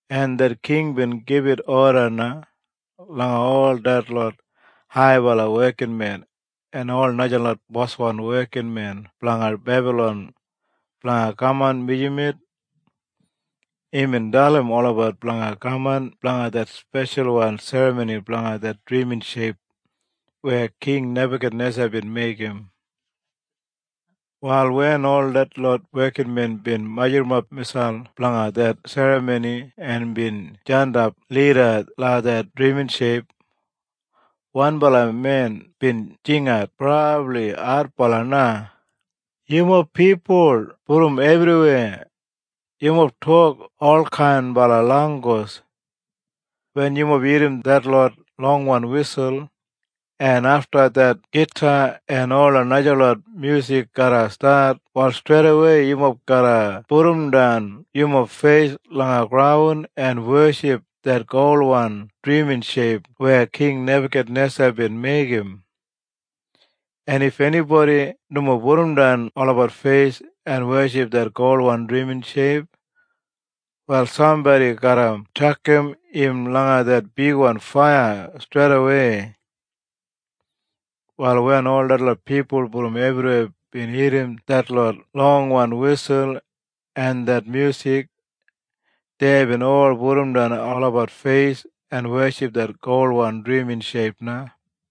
En det king bin gibit oda na langa ol detlot haibala wekinmen en ola najalot boswan wekinmen blanga Bebalon blanga kaman mijamet. Imbin dalim olabat blanga kaman blanga det speshalwan serramoni blanga det drimin sheip weya King Nebakanesa bin meigim. Wal wen ol detlot wekinmen bin majurrumap miselp blanga det serramoni en bin jandap lida langa det drimin sheip, wanbala men bin jingat brabli adbala na, “Yumob pipul brom ebriweya, yumob tok olkainbala langgus. Wen yumob irrim detlot longwan wisul, en afta det gita en ola najalot myusik garra stat wal streidawei yumob garra pudumdan yumob feis langa graun en weship det golwan drimin sheip weya King Nebakanesa bin meigim. En if enibodi nomo pudumdan olabat feis en weship det golwan drimin sheip, wal sambodi garra tjakam im langa det bigwan faiya streidawei.” Wal wen ol detlot pipul brom ebriweya bin irrim detlot longwan wisul en det myusik, deibin ol pudumdan olabat feis en weship det golwan drimin sheip na.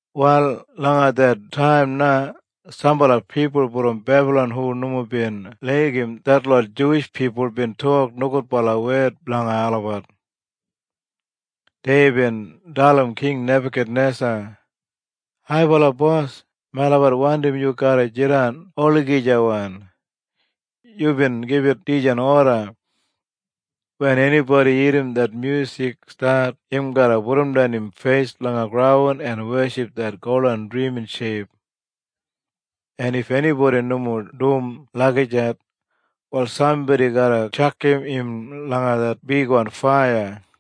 Wal langa det taim na sambala pipul brom Bebalon hu nomo bin laigim detlot Juwish pipul bin tok nogudbala wed blanga olabat. Deibin dalim King Nebakanesa, “Haibala bos, melabat wandim yu garra jidan olagijawan! Yubin gibit dijan oda, ‘Wen enibodi irrim det myusik stat im garra pudumdan im feis langa graun en weship det golwan drimin sheip. En if enibodi nomo dum lagijat, wal sambodi garra tjakam im langa det bigwan faiya.’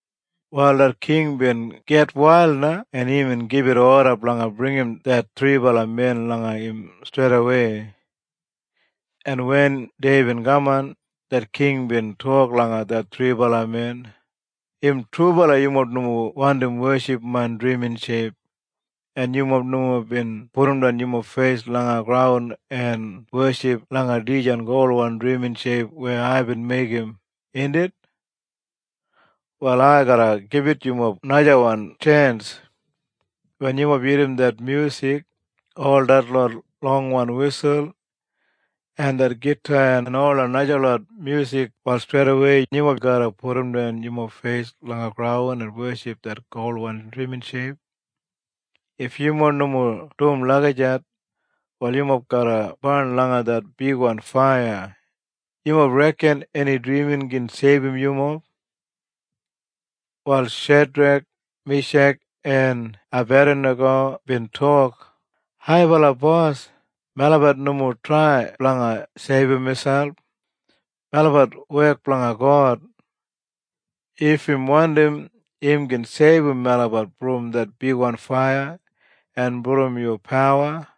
Wal det king bin gitwail na en imbin gibit oda blanga bringim det thribala men langa im streidawei. En wen deibin kaman, det king bin tok langa det thribala men, “Im trubala yu nomo wandim weship main drimin sheip, en yumob nomo bin pudumdan yumob feis langa graun en weship langa dijan golwan drimin sheip weya aibin meigim, indit? Wal ai garra gibit yumob najawan tjens. Wen yumob irrim det myusik, ol detlot longwan wisul, en det gita en ola najalot myusik, wal streidawei yumob garra pudumdan yumob feis langa graun en weship det golwan drimin sheip. If yumob nomo dum lagijat, wal yumob garra barn langa det bigwan faiya. Yumob reken eni drimin gin seibum yumob?” Wal Shedrek, Mishak en Ebadinago bin tok, “Haibala bos, melabat nomo trai blanga seibum miselp. Melabat wek blanga God. If im wandim im gin seibum melabat brom det bigwan faiya en brom yu pawa.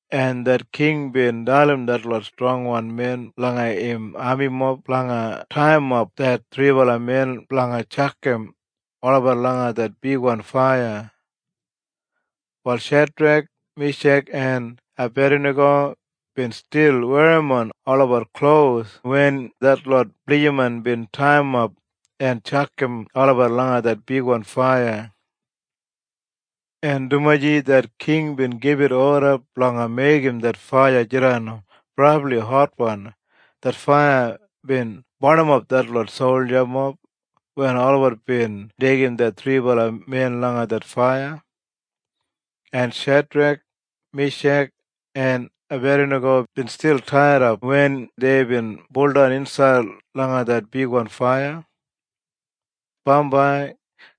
En det king bin dalim detlot strongwan men langa im amimob blanga taiyimap det thribala men blanga tjakam olabat langa det bigwan faiya. Wal Shedrek, Mishak en Ebadinago bin stil werrimon olabat klos wen detlot blijiman bin taiyimap en tjakam olabat langa det bigwan faiya. En dumaji det king bin gibit oda blanga meigim det faiya jidan brabli hotwan, det faiya bin barnimap detlot soljamob wen olabat bin deigim det thribala men langa det faiya. En Shedrek, Mishak en Ebadinago bin stil taidap wen deibin buldan insaid langa det bigwan faiya. Bambai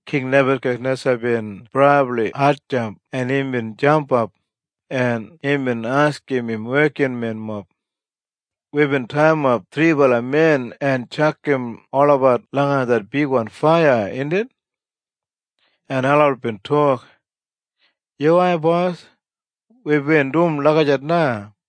King Nebakanesa bin brabli hatjamp en imbin jampap, en imbin askim im wekinmenmob, “Wibin taiyimap thribala men en tjakam olabat langa det bigwan faiya, indit?” En olabat bin tok, “Yuwai bos. Wibin dum lagijat na.”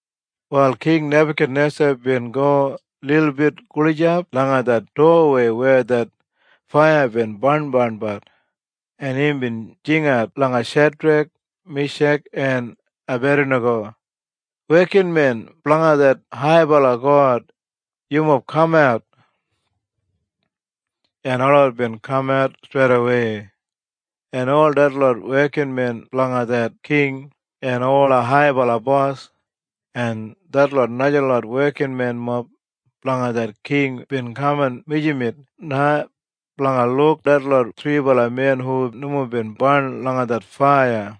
Wal King Nebakanesa bin go lilbit gulijap langa det dowa weya det faiya bin barnbarnbat, en imbin jingat langa Shedrek, Mishak en Ebadinago, “Wekinmen blanga det haibala God, yumob kamat!” En olabat bin kamat streidawei. En ol detlot wekinmen blanga det king en ola haibala bos, en detlot najalot wekinmenmob blanga det king bin kaman mijamet na blanga luk detlot thribala men hu nomo bin barn langa det faiya.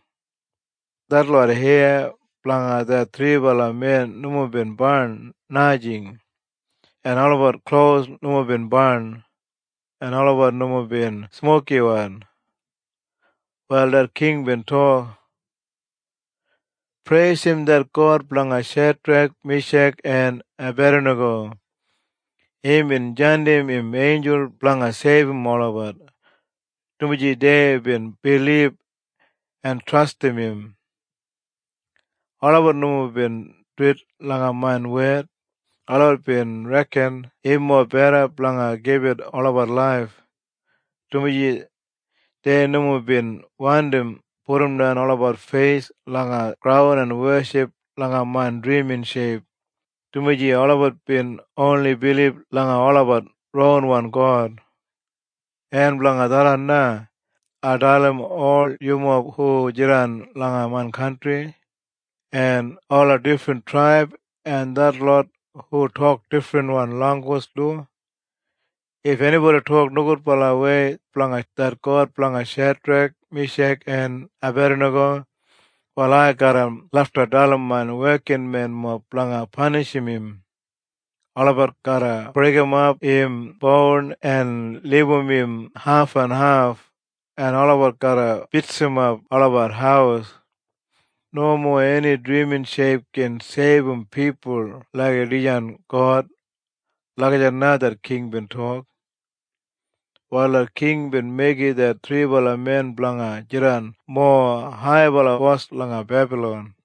Detlot heya blanga det thribala men nomo bin barn, najing, en olabat klos nomo bin barn, en olabat nomo bin smokiwan. Wal det king bin tok, “Preisim det God blanga Shedrek, Mishak en Ebadinago. Imbin jandim im einjul blanga seibum olabat, dumaji deibin bilib en trastim im. Olabat nomo bin duwit langa main wed. Olabat bin reken im mobeda blanga gibit olabat laif, dumaji dei nomo bin wandim pudumdan olabat feis langa graun en weship langa main drimin sheip, dumaji olabat bin oni bilib langa olabat ronwan God. En blanga tharran na, ai dalim ol yumob hu jidan langa main kantri, en ola difrin traib en detlot hu tok difrinwan langgus du. If enibodi tok nogudwei blanga det God blanga Shedrek, Mishak en Ebadinago, wal ai garra lafta dalim main wekinmenmob blanga panishim im. Olabat garra breigimap im boun en libum im hafenhaf en olabat garra bitsimap olabat haus. Nomo eni drimin sheip gin seibum pipul laik dijan God.” Lagijat na det king bin tok. Wal det king bin meigim det thribala men blanga jidan mowa haibala bos langa Bebalon.